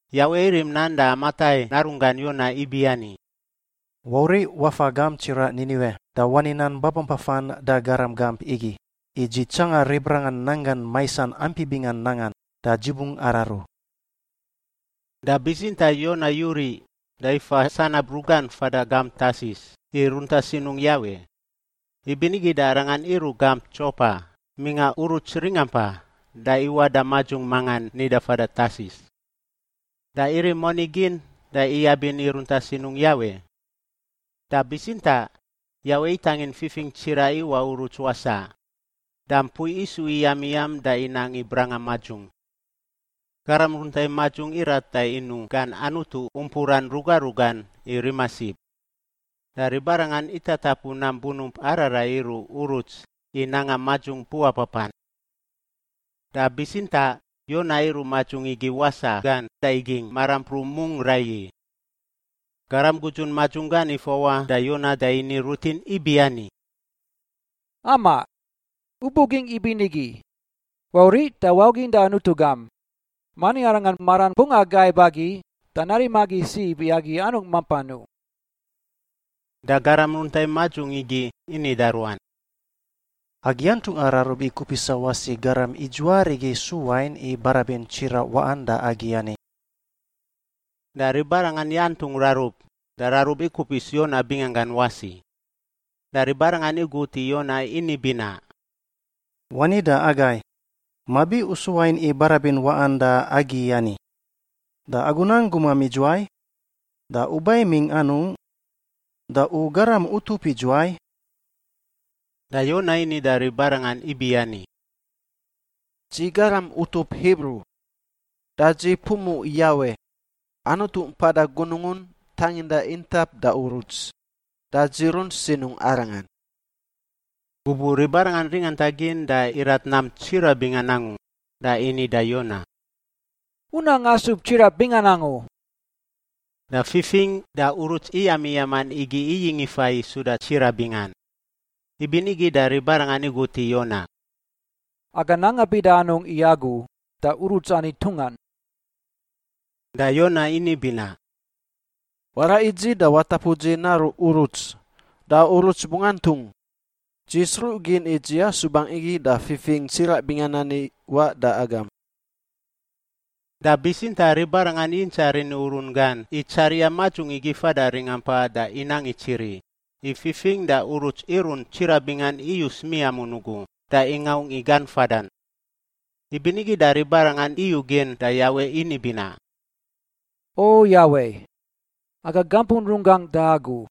Yawe irim nan da Amitai narunggan Yona ibiani, “Wauriꞌ wafa gamp tsiraꞌ Niniwe da wani nan babampafan da garam gamp igi, i Dzi tsanga ribarangan nanggan maisan ampi bingan nangan, da Dzi bungꞌ araru.” Da bitsintaꞌ Yona yuriꞌ da ifa sanab rugan fada gamp Tarsis i runta sinungꞌ Yawe. Ibinigi da arangan iruꞌ gamp Dzopa mingꞌa uruts ringampa da iwaꞌ da madzung mangan nida fada Tarsis. Da irim moni gin da iyabin i runta sinungꞌ Yawe. Da bitsintaꞌ Yawe itangin fifing tsiraꞌ iwaꞌ uruts wasaꞌ, da mpui isu iyamiyam da inang i branga madzung. Garam runta i madzung irat da inuꞌ gan anutu umpuran ruga rugan i rima sib. Da ribarangan itatapu nam bunump ararai iruꞌ uruts i nanga madzung puapapan. Da bitsintaꞌ Yona iruꞌ madzung igi wasaꞌ gan da igingꞌ marampruꞌ mungꞌ raiyi. Garam gudzun madzung gan ifawaꞌ da Yona da ini rutin ibiani, “Amaꞌ! U bugingꞌ ibinigi? Wauriꞌ da waugin da anutu gam! Mani arangan maran bungꞌ agaib agi da narim agi sib i agi anungꞌ mampan u.” Da garam runta i madzung igi ini da ruan, “Agi antungꞌa rarub i kupisa wasi garam idzuwaarigi su wain i barabin tsiraꞌ waꞌan da agi ani.” Da ribarangan yantungꞌ rarub, da rarub ikupis Yona binganggan wasi. Da ribarangan igut i Yona ini binaꞌ, “Wani da agai! Mabi u su wain i barabin waꞌan da agi ani? Da agu nang gumam idzuwai? Da u ba imingꞌ anungꞌ? Da u garam utup idzuwai?” Da Yona ini da ribarangan ibiani, “Dzi garam utup Hibru, da dzi pumuꞌ Yawe, Anutu mpada gunungun tanginda intap da uruts. Da dzi runt sinungꞌ Arangan.” Gubuꞌ ribarangan ringanta gin da irat nam tsiraꞌ bingan angu da ini da Yona, “U nang asub tsiraꞌ bingan angu!” Da fifing da uruts iyamiyaman igi iyingꞌ ifa i suda tsiraꞌ bingan. Ibinigi da ribarangan igut i Yona, “Aga nanga bida anungꞌ i agu da uruts ani ntungan?” Da Yona ini binaꞌ, “Waraꞌ i dzi da watapu dzi naruꞌ uruts, da uruts bungꞌ antung. Dzi sruꞌ gin i dzi asubangꞌ igi da fifing tsiraꞌ bingan ani iwaꞌ da agam.” Da bitsintaꞌ ribarangan yintsaꞌ rini urun gan i tsariꞌa madzung igi fada ringampa da inang itsiri, i fifing da uruts irunt tsiraꞌ bingan iyus miamun ugu da ingaungꞌ i gan fadan. Ibinigi da ribarangan iyugin da Yawe ini binaꞌ, “O Yawe! Aga gampun runggangꞌ da Agu.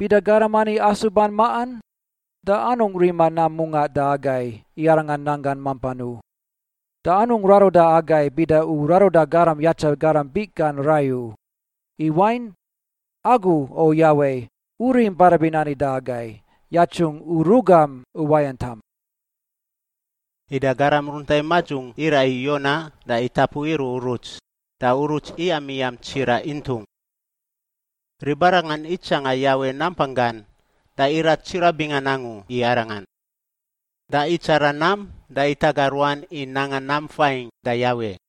Bida garam ani asuban maꞌan, da anungꞌ rima nam mungaꞌ da agai i arangan nanggan mampan u. Da anungꞌ raruda agai bida U raruda garam yatsa garam biꞌ gan rai u, i wain, Agu, O Yawe, U rim barabin ani da agai, yatsungꞌ U rugam uwayantam.” Ida garam runta i madzung iraꞌ i Yona da itapu iruꞌ uruts, da uruts iyamiyam tsiraꞌ intung. Ribarangan itsanga Yawe nampang gan da irat tsiraꞌ bingan angu i Arangan, da itsara nam da itaga ruan i nanga nam fain da Yawe.